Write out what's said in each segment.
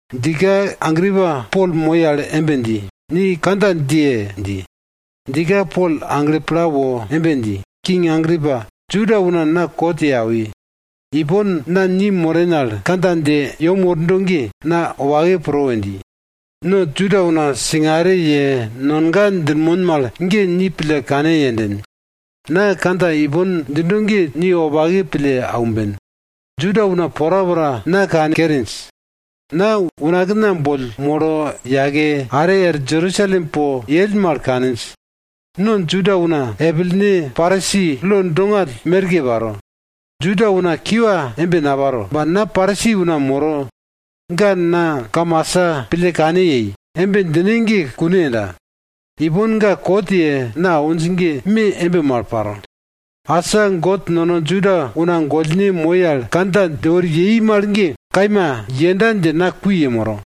Djika Agripa Pol moi al embe dji, ni kandja djiye! dji. Djika Pol agle pla woro embe dji, king Agripa, Juda una na kot ye awi. Ipon na ni moren al kandja dje yem wordo ge, na wopake pro we dji. No Juda una singare ye, nonga djinmon mal ge ni pille kane yenden. Na kandja ipon djindo ge ni wopake pille aumben. Juda una porapora na kankerinj. Na unakna boll molo yake, are er Jerusalem po yell mal kaninj. No Juda una epilene Parisi lo dongall merke paro, Juda una kiwa embe naparo, ba na Parisi una moro, ga na kamasa pille kane yei, embe djine ge kune yenda. Ipon ga kot ye na awinj ge me embe mal paro. Asa God nono Juda una gollne moi al kandja dje wori yei mal ge, kaima yenda dje na kui yemoro.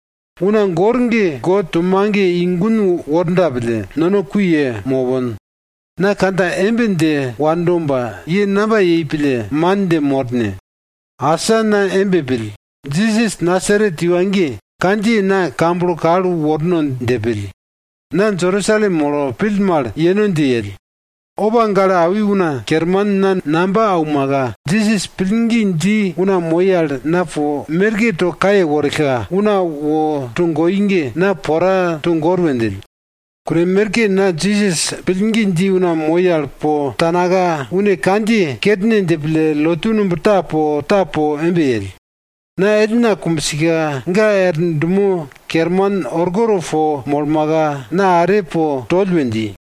Una gor ge God to mage i gun worda pille, nono kui ye mopon. Na kandja embe dje wando ba, ye namba yei pille man dje mor ne? Asa na embe pill, Jisas Nasaret iwa ge, kandjiye na kamblo kal worno dje pill. Na Jerusalem molo pill mal yeno dje yell. Opa gale awi una kerman na namba aumaka, Jisas pillgi dji una moi al na po merke to kaye worillka, una wo togoi ge, na pora togor we djill. Kune merke na Jisas pillgi dji una moi al po tanaka, une kandjiye kerne dje pille lotu numb ta po, ta po embe yell. Na ellna kumbsika ga er dumo kerman orkoto po molmaka, na are po toll we dji.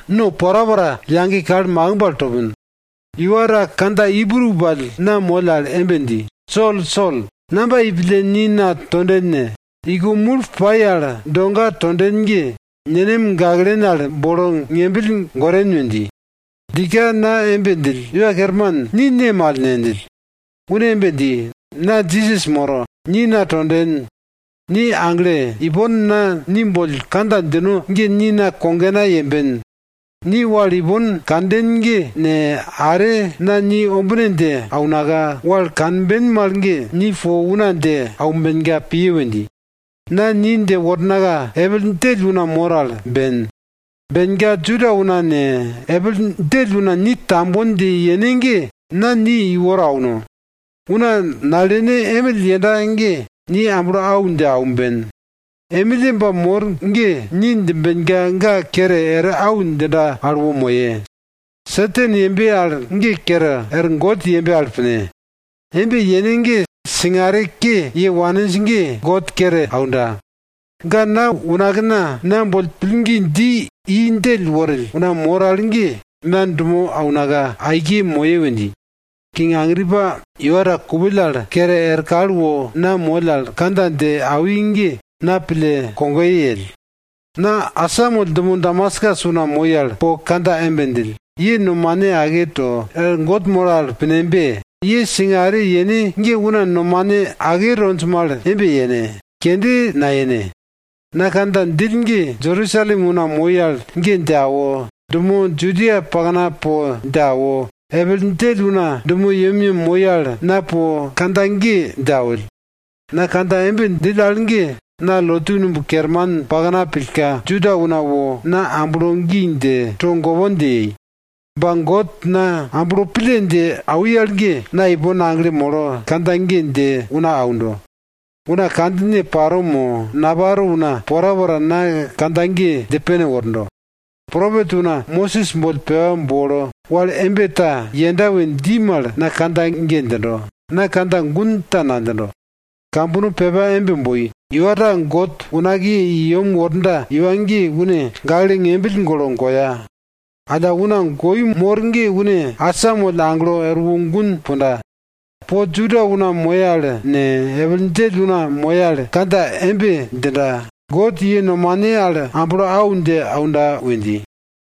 no porapora yage kal makimb al topin. Iwa ta kandja Ibru pall na moll al embe dji, Sol, Sol, namba yei pille ni na tonden ne? Iko mul pai al doga tonden ge, nenem gaklen al bolo ngembill goren we dji. Djika na embe djill, Iwa Kerman, ni ne mal ne? djill. Une embe dji, na Jisas moro, ni na tonden. Ni agle! Ipon na ni boll kandja djino ge ni na kogena yemben. Ni wal ipon kanden ge ne, are na ni ombine dje aunaka, wal kanben mal ge, ni po una dje aumbenka piye we dji. Na ni dje wornaka, epil djell una mor al ben. Benka Juda una ne, epil djell una ni tambon dje yene ge, na ni iworo auno. Una nalene emill yenda ge ni amblo au dje aumben. Emilleba mor ge ni djimbenka ga kere er au djinda al wo moye. Satan yembe al ge kere er God yembe al pine. Embe yene ge singare ke ye waninj ge, God kere aunda. Ga na unakna na boll pillgi dji i djell worill una mor al ge na dumo aunaka aike moye we dji. King Agripa, iwa ta kupill al kere er kal wo na moll al kandja dje awi ge na pille kogoye yell. Na asamoll dumo Damaskus una moi al po kandja embe djill, ye nomane ake to, er God moro al pinembe! Ye singare yene ge una nomane ake tonj mal embe yene, kende nayene. Na kandja djill ge Jerusalem una moi al ge dje awo, dumo Judia pakna po dje awo, epil djell una dumo yemyem moi al, na po kandja ge dje awill. Na kandja embe djill al ge, na lotu numb kerman pakna pillka, Juda una wo na amblo gi dje, togopon dje yei. Ba God na amblo pille dje awi al ge, na ipon aglo molo kandja ge dje una aundo. Una kandjine paro mo, naparo una porapora na kandja ge dje pene wordo. Propet una, Mosis boll pepa bolo, wal embe ta yenda we dji mal, na kandja ge djindo, na kandja gun ta nadjindo. Kambono pepa embe boi, iwa ta God unakiye i yem worda iwa ge, une gakle ngembill golo goya. Alla una goi mor ge une asamoll aglo erwo gun punda. Po Juda una moye al ne, epil djell una moye al, kandja embe djinda, God ye nomane al amblo au dje aunda we dji.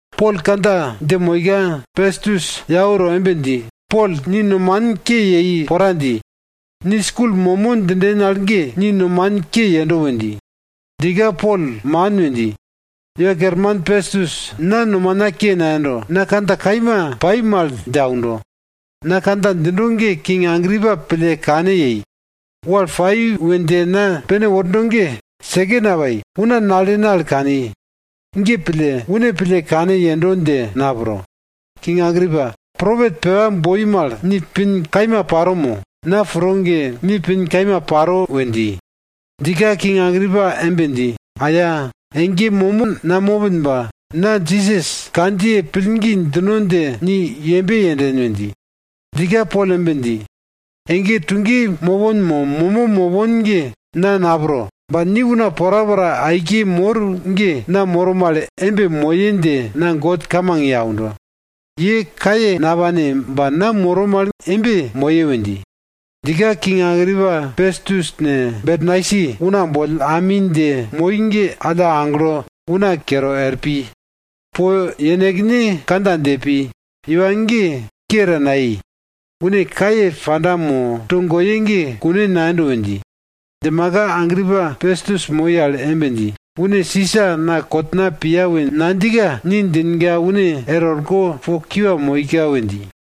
Pol kandja dje moika, Pestus yau to embe dji, Pol, ni nomanin ke yei pora dji. Ni skul momo djinden al ge, ni nomanin ke yendo we dji. Djika Pol, man we dji, iwa kerman Pestus, na nomana ke nayendo. Na kandja kaima pai mal dje aundo. Na kandja djindo ge king Agripa pille kane yei. Wal pai we dje na dje pene wordo ge seke napai, una nalene al kani. Ge pille une pille kane yendo dje na pro. King Agripa, propet pepa boi mal ni pin kaima paro mo? Na pro ge, ni pin kaima paro we dji. Djika, king Agripa embe dji, Aya! Ege momo namopin ba, na Jisas kandjiye pillgi djino dje ni yembe yenden! we dji. Djika Pol embe dji, ege tuge mopon mo momo mopon ge na napro. Ba ni una porapora aike mor ge, na moro mal embe moye dje na God kamang ye aundo. Ye kaye napane ba na moro mal embe moye we dji. Djika king Agripa ne, Pestus ne, Bernaisi una boll ami dje moi ge alla aglo una kere er pi. Po yenekne kandja dje pi, iwa ge ke ta nayei. Une kaye panda mo togoye ge kune nayendo we dji. Djimaka Agripa Pestus moi al embe dji, une Sisa na kotna piya we nadjika ni djinka une er orko po kiwa moika we dji.